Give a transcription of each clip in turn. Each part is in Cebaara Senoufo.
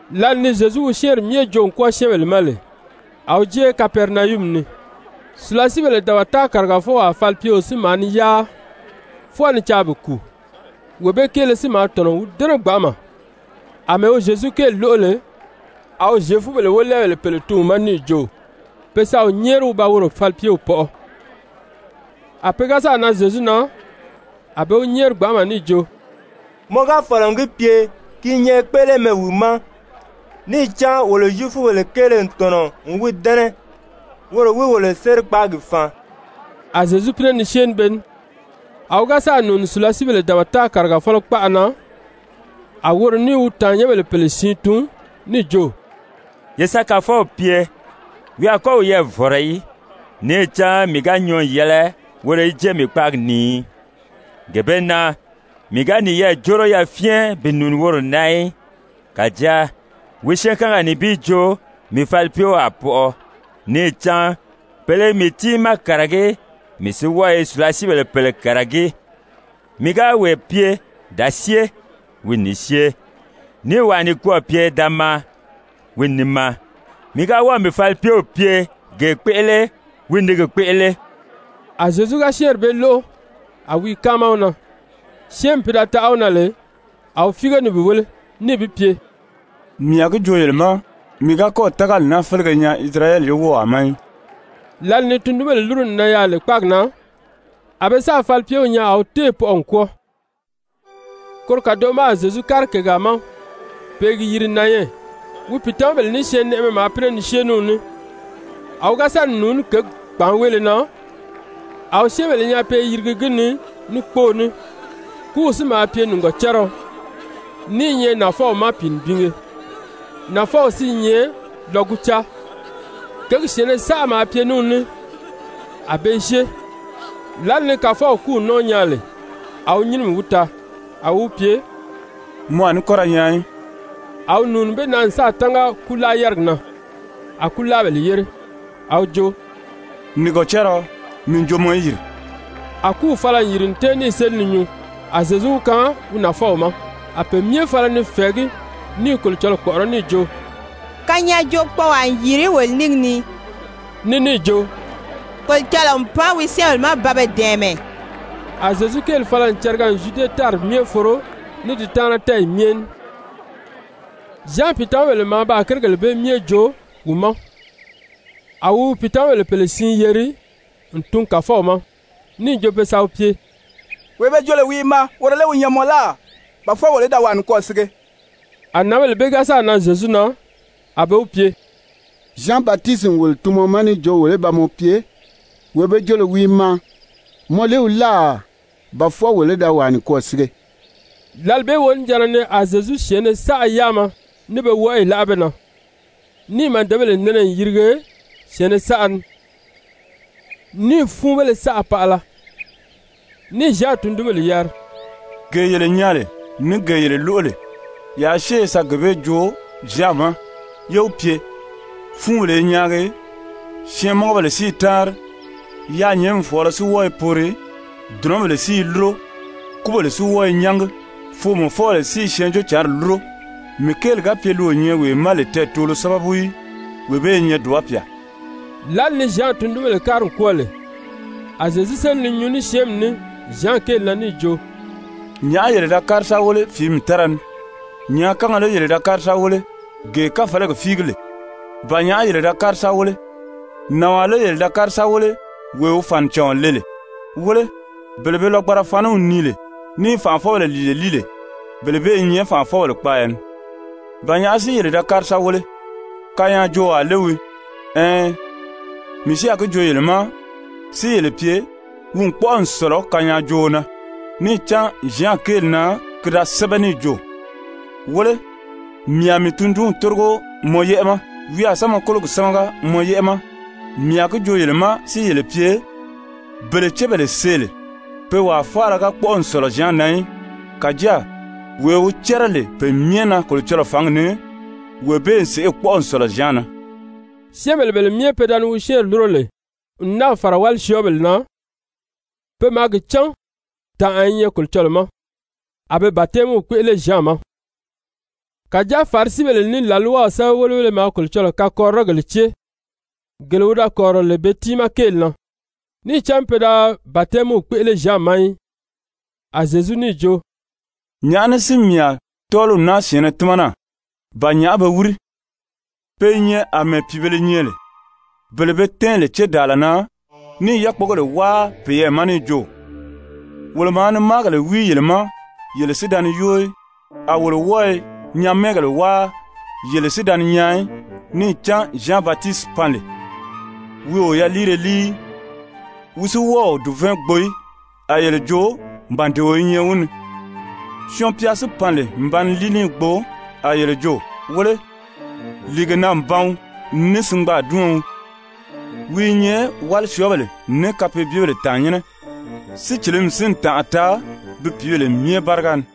Lǎli ni Zyezu wi syɛ́ɛnri myɛ joo n kwɔ́ɔ syɛ́ɛnbèle ma lè, a wi jée Kapɛrinayumi ni. Sùlasiibéle dabata kàrigafɔwaa falipyeo si maa ni yáa, fwɔɔ ni caa bi kùu, wee bee kéele si maa tɔ̀nɔ n wi dɛ́nɛ gbanʔama. Amɛɛ wi Zyezu kéeli lóʔo lè, a wi Zyefubèle wólɛɛbèle pèle tun wi ma níì jo pe sa wi nyɛ́ɛri wi ba woro falipyew pɔʔɔ. A pe ga sáà nan Zyezu na, a be wi nyɛ́ɛri gbanʔama níì jo: «Mɔ ga fɔ̀lɔ n gi pye, ki i nyɛ kpéʔelemɛ wi ma. Níì cán wolo Zyefubèle kéele n tɔ̀nɔ n wi dɛ́nɛ, woro wi wolo sérikpaagi faan.» A Zyezu pínɛ ni syée ní be ní, a wi ga sáà nùuni sùlasiibèle dabata kàrigafɔlɔ kpaʔa na, a woro níì wi tàannyɛnbèle pèle tun níì jo: «Ye sa Kàfɔw pye, wi a kɔ́ wiyɛɛ vɔ̀rɔ í. Níì cán mii ga nyɔɔ n yɛlɛ woro í jée mii kpáagi ni í. Gee bee na mii ga niyɛɛ jóro yafyɛn bi nùuni woro na í. Kàjáa wi syɛɛnkanga nibin joo, mii falipyew a pɔʔɔ. Níì cán pèle i mii tiimaa kàragí, mii si wɔ́ɔ i sùlasiibèle pèle kàragí. Mii ga wee pye: ‹Da syée!› Wi n ni syée. Níì wàa nikwɔɔ pye: ‹Da maa!›Wi n ni maa. Mii ga wɔ́ɔ̀ mii falipyew pye: ‹Gee kpéʔele!› Wi n ni gi kpéʔele.» A Zyezu ga syɛ́ɛnri bee lóʔo, a wi i káama wi na, syɛ́ɛnmi pi da taʔa wi na lè, a wi fíige ni bi wéle, níì bi pye: «Mii a gi joo yele ma, mii ga kɔ́ɔ̀ tágali naa félege nyaa Isirayɛli ye wówaa ma í.» Lǎli ni tundunbèle lúru n nan yaà lè kpáagi na, a be sáà falipyew nyaa a wi téè pɔʔɔ n kwɔ́ɔ. Koro kàdoʔo ma a Zyezu kári kègaa ma pe i gi yiri Nayɛn. Wi pìitamabèle ní syɛɛnnɛʔɛmɛ maa pínɛ ni syée ní wi ní. A wi ga sa ni nùuní kěgi kpàánweele na, a wi syɛ́ɛnbèle nyaa pe i yirigi gi ni ní kpóō ní, kúw si maa pye nìgɔcariɔ, ní i nyɛ nafɔw ma pìinibinge, nafɔw si i nyɛ lɔgucaa. Kěgi syɛ̀ɛnnɛ saʔa maa pye ní wi ní a be i syée. Lǎli ni Kàfɔw kúw nɔ́ɔ nyaa lè, a wi nyínimi wi taa. A wi wi pye: «Mɔ a ní kɔ́ ra nyaan í!» A wi nùuni be na n sáà tánga kúlaa-yárigi na. A kúlaabèle yére. A wi jo: «Nìgɔcariɔ, mii n jo mɔ í yìri!» A kúw fala n yìri n tɛ́ɛn níì séli ni nyuu. A Zyezu wi kaan wi nafɔw ma. A pe myɛ fala ni fɛ̀ɛgí ní i Kolocɔlɔɔ kpɔ̀ʔɔrɔ́ níì jo: «Kanyaajookpɔɔwaa n yìri wolo nínge ni.» Ní níì jo: «Kolocɔlɔɔ n pan wi syɛ́ɛnbèle ma ba be dɛ̀ɛmɛ.» A Zyezu kéeli fala n cariga n Zyude tári myɛ foro ní di taana tɛ́ɛyi myɛ ní. Zyan pìitamabèle maa baa kérigèle bee myɛ joo wi ma. A wi wi pìitamabèle pèle siin yeri n tun Kàfɔw ma níì jo pe sa wi pye: «Wee be jo lè wi i maa, woro lé wi nyɛ mɔ láà, ba fwɔɔ wolo í da wàa nikwɔɔ sige?» A nǎnbèle bee ga sáà nan Zyezu na, a be wi pye: «Zyan Batisiti n wolo tun mɔ ma níì jo wolo í ba mɔ pye: ‹Wee be joo lè wi i maa, mɔ lé wi láà, ba fwɔɔ wolo í da wàa nikwɔɔ sige?›» Lǎli bee wonijanna ni a Zyezu syɛ̀ɛnnɛ saʔa yáama ní pe wɔʔɔyi láʔa be na, níì màdebèle nɛnɛ n yirige syɛ̀ɛnnɛ saʔa ni, níì fúunbéle saʔa paʔala, níì Zyan tundunbèle yari: «Gee yele nyaa lè ní gee yele lóʔo lè, yaa syée ye sa gee bee joo Zyan ma yé wi pye: ‹Fúunbèle i nyaagi, syɛɛnmɔngɔbèle si i táanri, yaanyɛɛnmi fɔ̀ɔlɔ si wɔ́ɔ i poori. Dùnɔbèle si i lúro, kúbèle si wɔ́ɔ i nyángi, foomɔfɔbèle si i Syɛɛnjóocǎnri lúro. Mii kéeli ga pye li o nyɛ wee ma lè tɛɛtoolo sábabu í, wee bee i nyɛ dùba pyà.›» Lǎli ni Zyan tundunbèle kári n kwɔ́ɔ lè, a Zyezu séli ni nyuu ní syɛ́ɛnmi ní Zyan kéeli na níì jo: «Nyàʔá yele da kári sa wéle fìími tára ni? Nyàákanga lé yele da kári sa wéle, gee káfalagi fíigi lè? Ba nyàʔá yele da kári sa wéle? Nànwaa lé yele da kári sa wéle, wee wi fànicàɔn le lè? Wéle, bele be lɔgbanra faniw nii lè ní i fànʔafɔbèle lìile líi lè, bele bee i nyɛ fànʔafɔbèle kpaaya ni. Ba nyàʔá si yele da kári sa wéle? Kanyaajoowaa lé wii? Ɛɛn, mii si a gi joo yele ma si yele pye, wi n kpɔ́ʔɔ n sɔ̀lɔ kanyaajooo na. Níì cán Zyan kéeli na ki da sɛ́bɛ níì jo: ‹Wéle, mii a mii tundunw tórigo mɔ yɛ́ʔɛ ma. Wi a sa mɔ kólogi sámaga mɔ yɛ́ʔɛ ma.› Mii a gi joo yele ma si yele pye, bele cébèle see lè, pe wàa faala ga kpɔ́ʔɔ n sɔ̀lɔ Zyan na í. Kàjáa wee wi cɛ́rɛ lè pe myɛ na Kolocɔlɔɔ fǎngi ni, wee bee n sèʔê kpɔ́ʔɔ n sɔ̀lɔ Zyan na.» Syɛ́ɛnbèle bele myɛ pe da ni wi syɛ́ɛnri lúro lè n náà fàra wálisyɔɔbèle na, pe maa gi cán tànʔa i nyɛ Kolocɔlɔɔ ma, a be batɛmiw kpéʔele Zyan ma. Kàjáa Farisibèle ní làlwaw sɛ́bɛwelebéle maa Kolocɔlɔɔ kakɔrirɔgèle cée, gele wi da kɔ̀rirɔ lè be tiimaa kéeli na, níì cán pe da batɛmiw kpéʔele Zyan ma í. A Zyezu níì jo: «Nyàʔá ní si mii a tɔ́ɔliw naa syɛ̀ɛnnɛ tímana? Ba nyàʔá be wíri? Pe i nyɛ àmɛɛ pìibēle nyɛ lè, bele be tɛ́ɛn lè cédaala na ní i yákpogèle wáa peyɛɛ ma níì jo: ‹Wolo maa ni máagèle wíi yele ma, yele si da ni yóo í. A wolo wɔ́ɔ i nyamɛɛgèle wáa, yele si da ni nyaan í.› Níì cán Zyan Batisiti pan lè, wi o yaliire líi í, wi si wɔ́ɔ o dùvɛɛn gbo í, a yele jo: ‹Màdeo i nyɛ wi ni.› Syɔɔn-pya si pan lè n ba ni líi ní i gbo, a yele jo: ‹Wéle, lìigena-n-ban ní singbaadiɔn wii, wi i nyɛ wálisyɔɔbèle ní kapeebyebèle tàannyɛnnɛ.› Sícilimi si n tànʔa taa bi pìíbèle myɛ báriga ni.»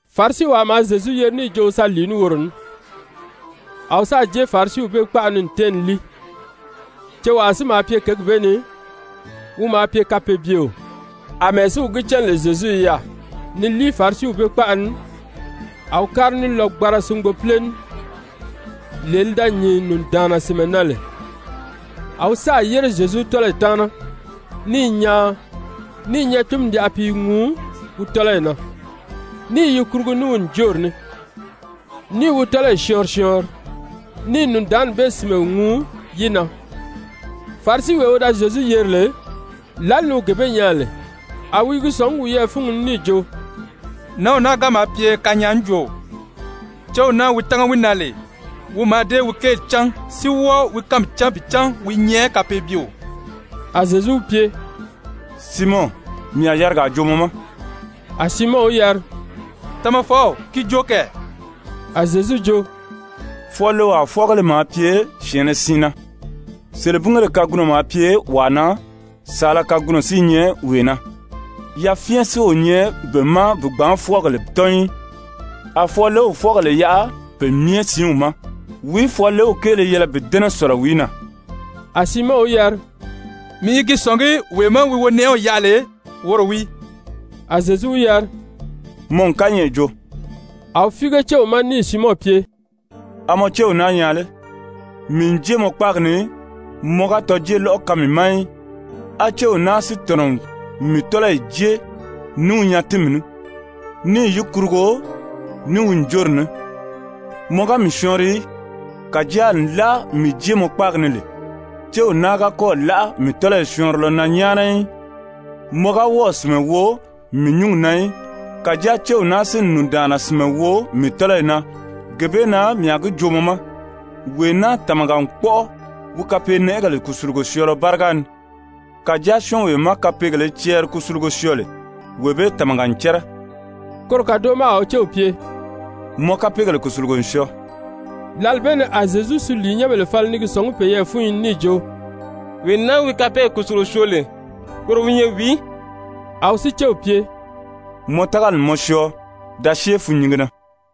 Farisiwaa maa Zyezu yeri níì jo wi sa lìi ní woro ní. A wi sáà jée Farisiw bee kpaʔa ni n tɛ́ɛn ni líi. Cewaa si maa pye kěgi bee ni, wi maa pye kapeebyeo. Amɛɛ si wi gi cán lè Zyezu i yaà ni líi Farisiw bee kpaʔa ni, a wi kári ní lɔgbanra singbopile ní, lee li da nyìn nùndaanna sìnmɛ na lè. A wi sáà yére Zyezu tɔ́lɔyi taana ní i nyaan, níì nyatinmi yaʔa pi i ŋuu wi tɔ́lɔyi na, ní i yi kurugu ní wi ǹjoori ní, ní i wi tɔ́lɔyi syɔɔnri syɔɔnri, ní i nùndaanni bee sìnmɛ ŋuu yi na. Farisiwee wi da Zyezu yeri lè, lǎli ni wi gee bee nyaa lè, a wi i gi sɔ̀ngí wiyɛɛ fúngi ni níì jo: «Nǎnw naa ga maa pye kanyaajooo, céw naa wi tángi wi na lè, wi mǎà dée wi kéeli cán si wɔ́ɔ wi kánmi cán bi cán wi i nyɛ kapeebyeo.» A Zyezu wi pye: «Siimɔn, mii a yarigaa joo mɔ ma.» A Siimɔn wi yari: «Tamafɔw, ki joo kɛ.» A Zyezu jo: «Fwɔɔlewaa fwɔ́ɔgéle maa pye syɛ̀ɛnnɛ siin na. Selebingéle kagunɔ maa pye wàa na, saala kagunɔ si i nyɛ wee na. Yafyɛn si o nyɛ be ma bi gbǎn fwɔ́ɔgèle tɔ́n í, a fwɔɔlew fwɔ́ɔgèle yaʔa pe myɛ siinw ma. Wìí fwɔɔlew kéele yɛlɛ bi dɛ́nɛ sɔ̀lɔ wìí na?» A Siimɔn wi yari: «Mii i gi sɔ̀ngí wee má wi wonɛʔɛw yaʔa lè, woro wii.» A Zyezu wi yari: «Mɔ n kányɛʔɛ joo.» A wi fíige céw ma níì Siimɔn pye: «A mɔ céw naa nyaa lé? Mii n jée mɔ kpáagi ni, mɔ ga tɔjeelɔʔɔ kaan mii ma í, á céw naa si tɔ̀nɔ n mii tɔ́lɔyi jée ní wi nyatinmi ní, níì yi kurugo ní wi ǹjoori ní. Mɔ ga mii syɔɔnri í, kàjáa nlaa mii jée mɔ kpáagi ni lè, céw naa ga kɔ́ɔ̀ láʔa mii tɔ́lɔyi syɔɔnrilɔ na nyáana í. Mɔ ga wɔ́ɔ̀ sìnmɛ wo mii nyúngi na í, kàjáa céw naa si n nùndaanna sìnmɛ wo mii tɔ́lɔyi na. Gee bee na mii a gi joo mɔ ma, wee naa tàmaga n kpɔ́ʔɔ wi kapeenɛʔɛgèle kùsulugo syɔɔlɔ báriga ni. Kàjáa syɔ́ɔnwee má kapeegèlē cɛɛri kusulugo syɔɔ lè, wee bee tàmaga n cɛ́rɛ.» Koro kàdoʔo ma a wi céw pye: «Mɔ kapeegèle kùsulugo n syɔɔ.» Lǎli bee ni a Zyezu suliinyɛnbèle fala ni gi sɔ̀ngí peyɛɛ fúnyi ni níì jo: «Wee naa wi kapeegèle kùsulugo syoo lè, woro wi nyɛ wìí?» A wi si céw pye: «Mɔ tágali n mɔ syɔɔ, da syée fûnnyinge na.»